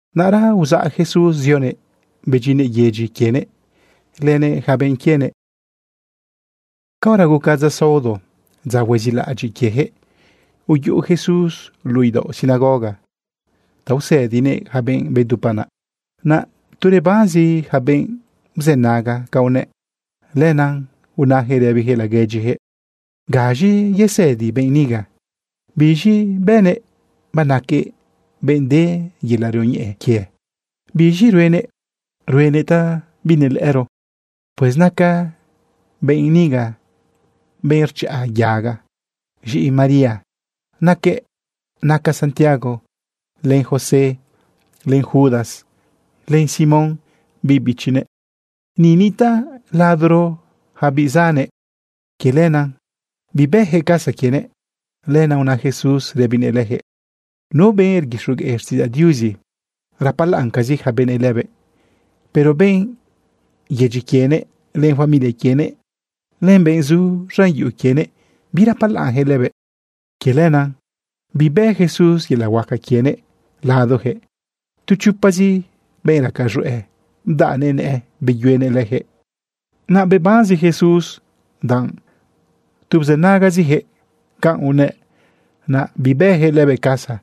Naꞌra uzaꞌ Jesús zionëꞌ bedyinnëꞌ yedyi quienëꞌ lënëꞌ yaca benꞌ quienëꞌ. Caora guca dza saodo, dza huezilaꞌadyiꞌ quieyaquëꞌ, uyuꞌu Jesús luꞌu idaoꞌ sinagoga ta usëdinëꞌ yaca benꞌ bdupa naꞌ. Naꞌ tu rebanzi yaca benꞌ bzënaga canꞌ unëꞌ. Lenaꞌ unayaquëꞌ rëbiyaquëꞌ laguedyiyaquëꞌ: ―¿Gaz̃i yesëdi benꞌ niga? ¿Biz̃i bënëꞌ banaquëꞌ benꞌ de yelaꞌ rioñeꞌe quie? ¿Biz̃i ruenëꞌ, ruenëꞌ ta binelëꞌëro? Pues naca benꞌ niga benꞌ rchaꞌa yaga. Z̃iꞌi María naquëꞌ. Naca Santiago, len José, len Judas, len Simón biꞌ bichinëꞌ. Ni nitaꞌ ladoro yaca biꞌ zannëꞌ. Quie lenaꞌ bibëyaquëꞌ casa quienëꞌ. Lenaꞌ una Jesús rëbinëꞌ leyaquëꞌ: ―Nu benꞌ rguixogueꞌ xtiꞌidzaꞌ Diuzi, rapalaꞌncazi yaca benëꞌ lëbëꞌ. Pero benꞌ yedyi quienëꞌ, len familia quienëꞌ, len benꞌ zu z̃an yuꞌu quienëꞌ, birapalaꞌnyaquëꞌ lëbëꞌ. Quie lenaꞌ bibë Jesús yelaꞌ huaca quienëꞌ ladoyaquëꞌ. Tu chopazi benꞌ raca z̃hueꞌ bdaꞌnëꞌ nëꞌë beyuenëꞌ leyaquëꞌ. Naꞌ bebanzi Jesús danꞌ tu bzënagaziyaquëꞌ canꞌ unëꞌ, naꞌ bibëyaquëꞌ lëbëꞌ casa.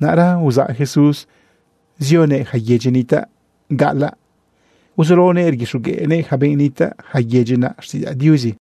Naꞌra uzaꞌ Jesús zioguëꞌ yaca yedyi nitaꞌ gaꞌalaꞌ, uzulaonëꞌ rguixogueꞌnëꞌ yaca benꞌ nitaꞌ yaca yedyi naꞌ xtiꞌidzaꞌ Diuzi.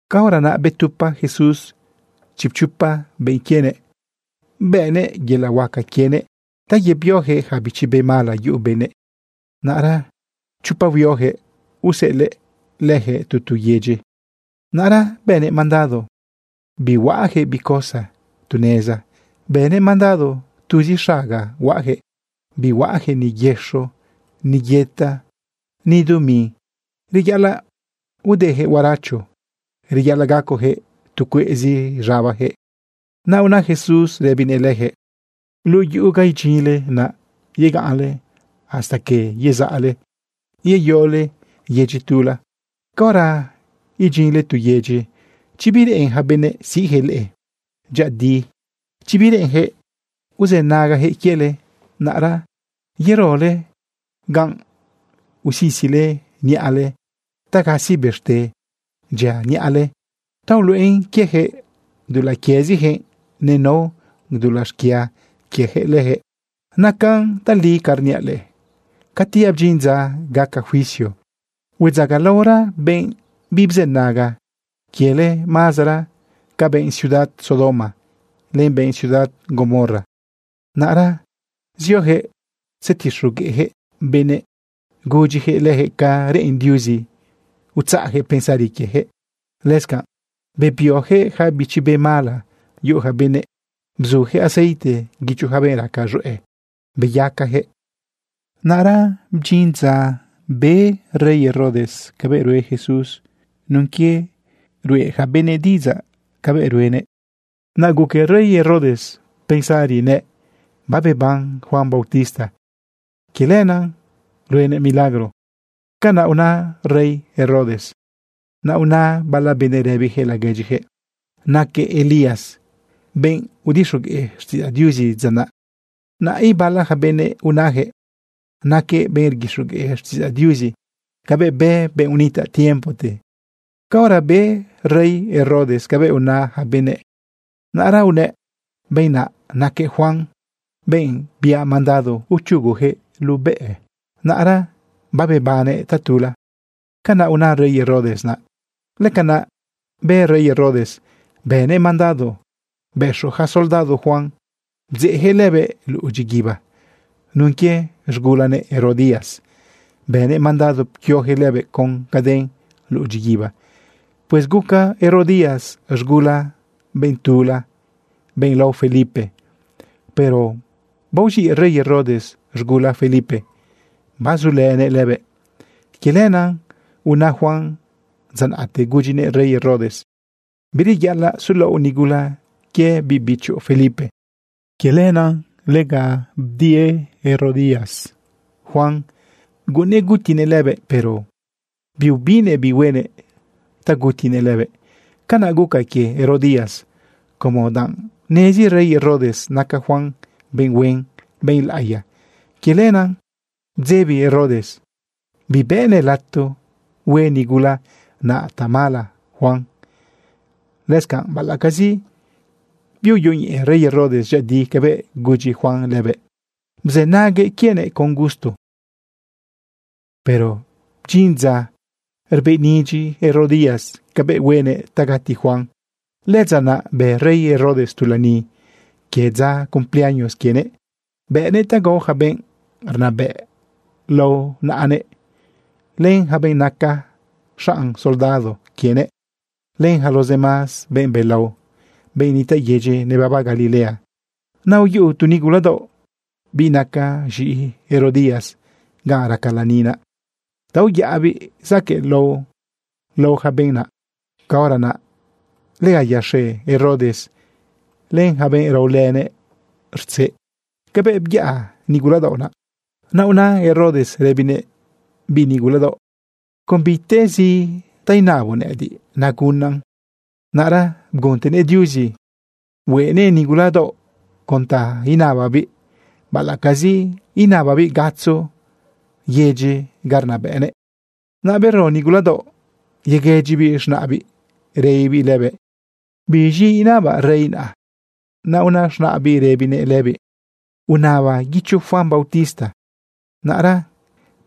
Caora naꞌ betupa Jesús chipchopa benꞌ quienëꞌ, bëꞌnëꞌ yelaꞌ huaca quienëꞌ ta yebioyaquëꞌ yaca bichi be mala yuꞌu benëꞌ. Naꞌra chopa huioyaquëꞌ useꞌelëꞌ leyaquëꞌ tu tu yedyi. Naꞌra bënëꞌ mandado bihuaꞌayaquëꞌ bi cosa tu neza. Bënëꞌ mandado tuzi xaga huaꞌayaquëꞌ. Bihuaꞌayaquëꞌ ni yëxo, ni yëta, ni dumi. Reyaꞌalaꞌ udeyaquëꞌ huaracho, reyaꞌalaꞌ gacoyaquëꞌ tu cueꞌzi z̃abayaquëꞌ. Naꞌ una Jesús rëbinëꞌ leyaquëꞌ: ―Luꞌu yuꞌu ganꞌ idyinle, naꞌ yegaꞌnle hasta que yezaꞌle yeyole yedyi tula. Caora abdyinle tu yedyi, chi bireꞌen yaca benëꞌ siꞌyaquëꞌ leꞌe dyëꞌëdi, chi bireꞌenyaquëꞌ uzënagayaquëꞌ quiele, naꞌra yerole ganꞌ, usisile niꞌale ta gasi bëxte dyia niꞌale ta uluꞌen quieyaquëꞌ dulaꞌ quieziyaquëꞌ nenao dulaꞌ xquia quieyaquëꞌ leyaquëꞌ. Nacan tali ca rniaꞌ leꞌe, cati abdyin dza gaca juicio, huedzagalaora benꞌ bibzënaga quiele mazara ca benꞌ ciudad Sodoma len benꞌ ciudad Gomorra. Naꞌra zioyaquëꞌ tzetixogueꞌyaquëꞌ benëꞌ gudyiyaquëꞌ leyaquëꞌ ca reꞌen Diuzi utzaꞌyaquëꞌ pensari quieyaquëꞌ. Lëscanꞌ bebioyaquëꞌ yaca bichi be mala yuꞌu yaca benëꞌ, bzuyaquëꞌ aceite guicho yaca benꞌ raca z̃hueꞌ, beyacayaquëꞌ. Naꞌra bdyin dza be rey Herodes cabëꞌ rue Jesús nun quie ruꞌe yaca benëꞌ diꞌidzaꞌ cabëꞌ ruenëꞌ. Naꞌ guque rey Herodes pensari nëꞌ: ―Babeban Juan bautista. Quie lenaꞌ ruenëꞌ milagro. ―Canaꞌ una rey Herodes naꞌ. Naꞌ una bala benëꞌ rëbiyaquëꞌ laguedyiyaquëꞌ: ―Naquëꞌ Elías, benꞌ udixogueꞌ xtiꞌidzaꞌ Diuzi dza naꞌ. Naꞌ ibala yaca benëꞌ unayaquëꞌ: ―Naquëꞌ benꞌ rguixogueꞌ xtiꞌidzaꞌ Diuzi cabëꞌ bë benꞌ unitaꞌ tiempote. Caora be rey Herodes cabëꞌ una yaca benëꞌ, naꞌra unëꞌ: ―Benꞌ naꞌ naquëꞌ Juan, benꞌ biaꞌ mandado uchuguyaquëꞌ lubaꞌnëꞌ. Naꞌra babebannëꞌ tatula. ―Canaꞌ una rey Herodes naꞌ. Lëcanaꞌ bë rey Herodes, bënëꞌ mandado bëxo yaca soldado Juan bdzeꞌyaquëꞌ lëbëꞌ luꞌu dyiguiba. Nun quie z̃gulanëꞌ Herodías bënëꞌ mandado pquioyaquëꞌ lëbëꞌ con caden luꞌu dyiguiba. Pues guca Herodías z̃gula benꞌ tula, benꞌ lao Felipe. Pero baoz̃iꞌ rey Herodes z̃gula Felipe, bazulënëꞌ lëbëꞌ. Quie lenaꞌ una Juan dza naꞌte gudyinëꞌ rey Herodes: ―Bireyaꞌalaꞌ sulaoꞌ nigula quie biꞌ bichoꞌ Felipe. Quie lenaꞌ lega udie Herodías Juan guꞌunnëꞌ gutinëꞌ lëbëꞌ, pero biubinnëꞌ bi huenëꞌ ta gutinëꞌ lëbëꞌ. Canaꞌ guca quie Herodías como danꞌ nezi rey Herodes naca Juan benꞌ huen, benꞌ laꞌiya. Quie lenaꞌ bdzebi Herodes bibëꞌnëꞌ lato hue nigula naꞌ tamala Juan. Lëscanꞌ, baꞌalaꞌcazi biuyoñeꞌe rey Herodes dyëꞌëdi cabëꞌ gudyi Juan lëbëꞌ, bzënaguëꞌ quienëꞌ con gusto. Pero bdyin dza rbëꞌnidyi Herodías cabëꞌ huenëꞌ ta gati Juan. Lëdza naꞌ bë rey Herodes tu lani quie dza cumpleaños quienëꞌ. Bëꞌnëꞌ ta gao yaca benꞌ rnabëꞌ lao naꞌanëꞌ, len yaca benꞌ naca xanꞌ soldado quienëꞌ, len yaca los demás benꞌ belao, benꞌ nitaꞌ yedyi nebaba Galilea. Naꞌ uyuꞌu tu nigula daoꞌ, biꞌ naca z̃iꞌi Herodías, ganꞌ raca lani naꞌ ta uyaꞌabiꞌ zaquëꞌlao lao yaca benꞌ naꞌ. Caora naꞌ lega yaxe Herodes len yaca benꞌ raolënëꞌ rtzeꞌ cabëꞌ byaꞌa nigula daoꞌ naꞌ. Naꞌ una Herodes rëbinëꞌ biꞌ nigula daoꞌ: ―Con bitezi ta inaboꞌ nëꞌëdiꞌ, nagunaꞌn. Naꞌra bguntenëꞌ Diuzi hueꞌnëꞌ nigula daoꞌ con ta inababiꞌ, baꞌalaꞌcazi inababiꞌ gatzo yedyi ga rnabëꞌnëꞌ. Naꞌ bero nigula daoꞌ yeguëdyibiꞌ z̃naꞌbiꞌ rëbibiꞌ lëbëꞌ: ―¿Biz̃i inabaꞌ rey naꞌ? Naꞌ una z̃naꞌbiꞌ rëbinëꞌ lëbiꞌ: ―Unaba guicho Juan bautista. Naꞌra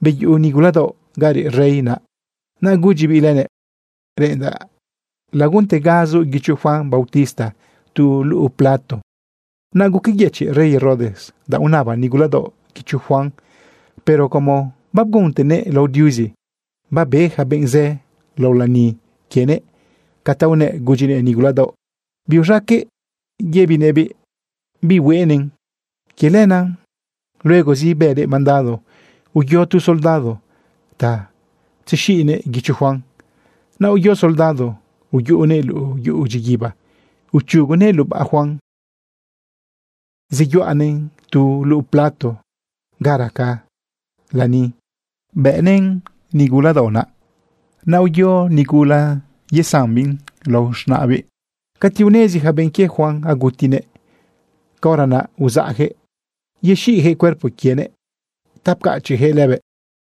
beyuꞌu nigula daoꞌ ga reꞌ rey naꞌ, naꞌ gudyibiꞌ lënëꞌ: ―Reꞌendaꞌ laguntegazoꞌ guicho Juan bautista tu luꞌu plato. Naꞌ guqueyëchiꞌ rey Herodes danꞌ unaba nigula daoꞌ guicho Juan. Pero como babguntenëꞌ lao Diuzi, babe yaca benꞌ zë lao lani quienëꞌ ca ta unëꞌ gudyinëꞌ nigula daoꞌ, biuz̃aqueꞌ yëbinëꞌbiꞌ bihueꞌnëꞌn. Quie lenaꞌ luegozi bënëꞌ mandado uyo tu soldado ta tzexiꞌnëꞌ guicho Juan. Naꞌ uyo soldado uyuꞌunëꞌ luꞌu yuꞌu dyiguiba, uchugunëꞌ lubaꞌ Juan, zeyuꞌanëꞌn tu luꞌu plato ga raca lani, bëꞌnëꞌn nigula daoꞌ naꞌ. Naꞌ uyo nigula yesambiꞌn lao z̃naꞌbiꞌ. Cati unezi yaca benꞌ quie Juan agutinëꞌ, caora naꞌ uzaꞌyaquëꞌ yexiꞌyaquëꞌ cuerpo quienëꞌ ta pcachiꞌyaquëꞌ lëbëꞌ.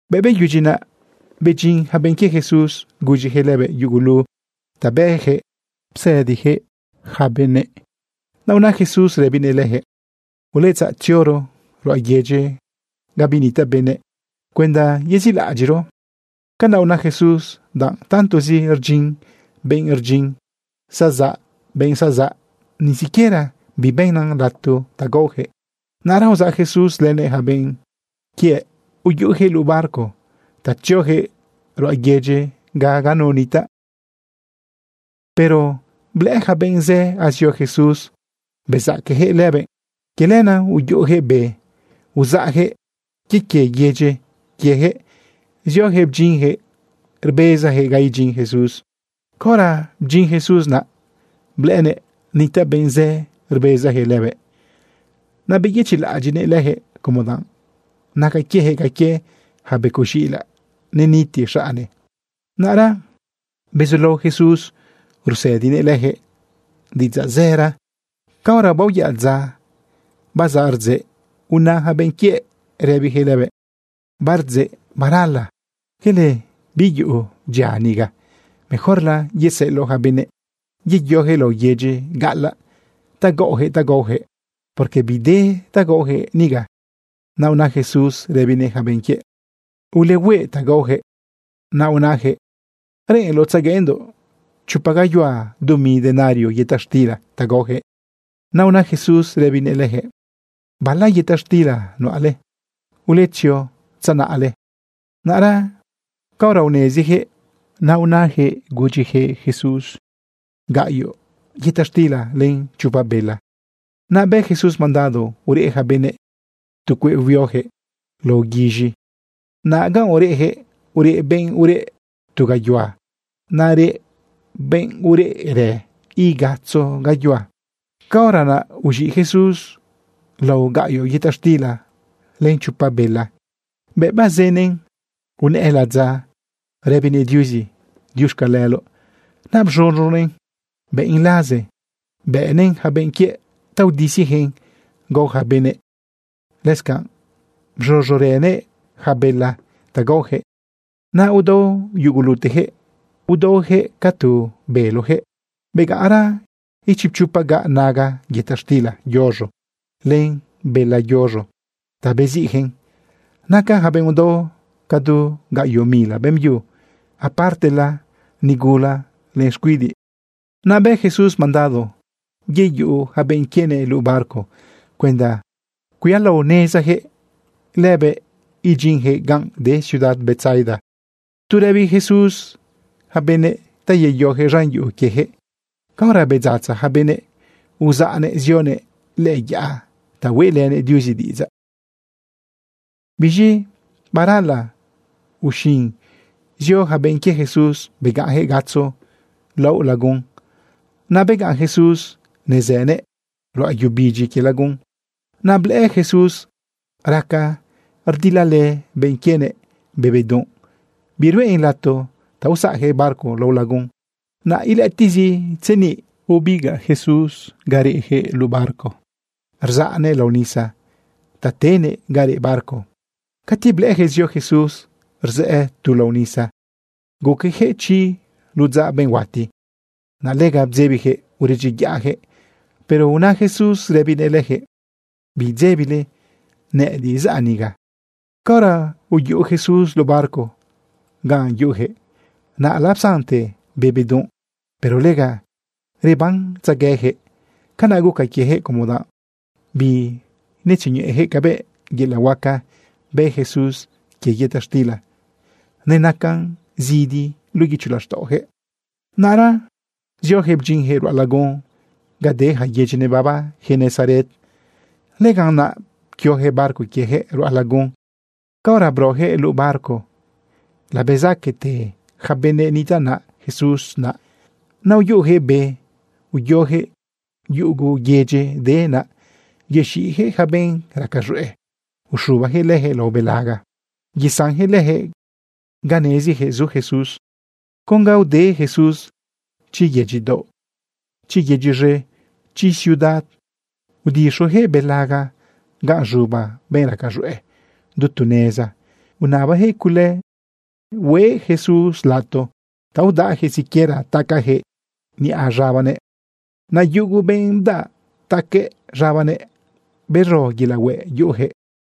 Bëꞌ beyudyi naꞌ, bedyin yaca benꞌ quie Jesús gudyiyaquëꞌ lëbëꞌ yugulu ta bëyaquëꞌ psëdiyaquëꞌ yaca benëꞌ. Naꞌ una Jesús rëbinëꞌ leyaquëꞌ: ―Uletzaꞌ tzioro ruꞌa yedyi ga binitaꞌ benëꞌ cuenda yezilaꞌadyiꞌro. Canaꞌ una Jesús danꞌ tantozi rdyin benꞌ rdyin, zazaꞌ benꞌ zazaꞌ, ni siquiera bibëꞌnan lato ta gaoyaquëꞌ. Naꞌra uzaꞌ Jesús lënëꞌ yaca benꞌ quiëꞌ, uyuꞌuyaquëꞌ luꞌu barco ta tzioyaquëꞌ ruꞌa yedyi ga nunu nitaꞌ. Pero blëꞌë yaca benꞌ zë azio Jesús bezaqueyaquëꞌ lëbëꞌ. Quie lenaꞌ uyuꞌuyaquëꞌ be, uzaꞌyaquëꞌ quie quie yedyi quieyaquëꞌ zioyaquëꞌ bdyinyaquëꞌ rbezayaquëꞌ ga idyin Jesús. Caora bdyin Jesús naꞌ, blëꞌënëꞌ nitaꞌ benꞌ zë rbezayaquëꞌ lëbëꞌ. Naꞌ beyëchiꞌlaꞌadyiꞌnëꞌ leyaquëꞌ, como danꞌ naca quieyaquëꞌ ca quie yaca becoꞌ z̃iꞌilaꞌ neniti xaꞌne. Naꞌra bezulao Jesús rusëdinëꞌ leyaquëꞌ diꞌidzaꞌ zëra. Caora baoyaꞌ dza, bazaꞌ rdzeꞌ, una yaca benꞌ quiëꞌ rëbiyaquëꞌ lëbëꞌ: ―Bardzeꞌ barala, quele biyuꞌu dyia niga. Mejorla yeseꞌeloꞌ yaca benëꞌ yeyoyaquëꞌ laꞌo yedyi gaꞌalaꞌ ta gaꞌoyaquëꞌ ta gaoyaquëꞌ, porque bide ta gaoyaquëꞌ niga. Naꞌ una Jesús rëbinëꞌ yaca benꞌ quiëꞌ: ―Ulehueꞌ ta gaoyaquëꞌ. Naꞌ unayaquëꞌ: ―¿Reꞌenloꞌ tzegueꞌendoꞌ chopa gayuhua dumi denario yëta xtila ta gaoyaquëꞌ? Naꞌ una Jesús rëbinëꞌ leyaquëꞌ: ―¿Bala yëta xtila nuꞌale? Uletzio tzenaꞌle. Naꞌra caora uneziyaquëꞌ unayaquëꞌ Jesús: ―Gaꞌyoꞌ yëta xtila len chopa bela. Naꞌ bë Jesús mandado ureꞌ yaca benëꞌ tu cueꞌ huioyaquëꞌ lao guiz̃i. Naꞌ ganꞌ ureꞌyaquëꞌ, ureꞌ benꞌ ureꞌ tu gayuhua. Naꞌ reꞌ benꞌ ureꞌrë igatzo gayuhua. Caora naꞌ uz̃iꞌ Jesús lao gaꞌyoꞌ yëta xtila len chopa bela. Bëꞌ bazënëꞌn, unëꞌë ladza rëbinëꞌ Diuzi diuxcaleloꞌ. Naꞌ bz̃uz̃unëꞌn bëꞌn laze. Bëꞌnëꞌn yaca benꞌ quiëꞌ ta udisiyaquëꞌn gao yaca benëꞌ. Lëscanꞌ bz̃uz̃urënëꞌ yaca bela ta gaoyaquëꞌ. Naꞌ udao yuguluteyaquëꞌ, udaoyaquëꞌ ca tu beloyaquëꞌ. Begaꞌnra ichipchopa gaꞌ naga yëta xtila yuz̃o len bela yuz̃o ta beziꞌyaquëꞌn. Naca yaca benꞌ udao ca du gaꞌyoꞌ mila beꞌmbyu, apartela nigula len xcuidiꞌ. Naꞌ bë Jesús mandado yeyuꞌu yaca benꞌ quienëꞌ luꞌu barco cuenda cuialaonezayaquëꞌ lëbëꞌ idyinyaquëꞌ ganꞌ de ciudad Betsaida, tu rëbi Jesús yaca benëꞌ ta yeyoyaquëꞌ z̃an yuꞌu quieyaquëꞌ. Caora bedzatza yaca benëꞌ, uzaꞌnëꞌ zionëꞌ lëꞌë yaꞌa ta hueꞌlënëꞌ Diuzi diꞌidzaꞌ. Biz̃i barala uxin zio yaca benꞌ quie Jesús begaꞌnyaquëꞌ gatzo laꞌo lagun. Naꞌ begaꞌn Jesús nezënëꞌ ruꞌa yu bidyi quie lagun. Naꞌ blëꞌë Jesús raca rdilalë benꞌ quienëꞌ be bedunꞌ, biruꞌen lato ta usaꞌyaquëꞌ barco lao lagun. Naꞌ ilëꞌëtiꞌzi tzeniꞌ, bebigaꞌ Jesús ga reꞌyaquëꞌ luꞌu barco rzaꞌnëꞌ lao nisa ta tenëꞌ ga reꞌ barco naꞌ. Cati blëꞌëyaquëꞌ zio Jesús rzëꞌë tu lao nisa, guqueyaquëꞌ chi ludzaꞌ benꞌ huati. Naꞌ lega bdzebiyaquëꞌ uredyiyaꞌyaquëꞌ. Pero una Jesús rëbinëꞌ leyaquëꞌ: ―Bidzebile, nëꞌëdiꞌ zaꞌ niga. Caora uyuꞌu Jesús luꞌu barco ganꞌ yuꞌuyaquëꞌ, naꞌ lapsante be bedunꞌ. Pero lega rebanetzegueyaquëꞌ. Canaꞌ guca quieyaquëꞌ, como danꞌ binetzioñeꞌeyaquëꞌ cabëꞌ yelaꞌ huaca bë Jesús quie yëta xtila. Nenacan zidi luꞌu guicho laxtaꞌoyaquëꞌ. Naꞌra zioyaquëꞌ bdyinyaquëꞌ ruꞌa lagun ga de yaca yedyi nebaba Genesaret. Lëganꞌ naꞌ pquioyaquëꞌ barco quieyaquëꞌ ruꞌa lagun. Caora broyaquëꞌ luꞌu barco labezaquete yaca benꞌ nitaꞌ naꞌ Jesús naꞌ. Naꞌ uyuꞌuyaquëꞌ be, uyoyaquëꞌ yugu yedyi de naꞌ, yexiꞌyaquëꞌ yaca benꞌ raca z̃hueꞌ, uxubayaquëꞌ leyaquëꞌ lao belaga, yesanyaquëꞌ leyaquëꞌ ga neziyaquëꞌ zu Jesús. Con ga ude Jesús, chi yedyi daoꞌ, chi yedyi z̃e, chi ciudad, udixoyaquëꞌ belaga ganꞌ z̃uba benꞌ raca z̃hueꞌ du tu neza, unabayaquëꞌ cule hueꞌ Jesús lato ta udaꞌyaquëꞌ siquiera tacayaquëꞌ niꞌa z̃abanëꞌ. Naꞌ yugu benꞌ bdaꞌ taque z̃abanëꞌ, bero yelaꞌ hueꞌ yuꞌuyaquëꞌ.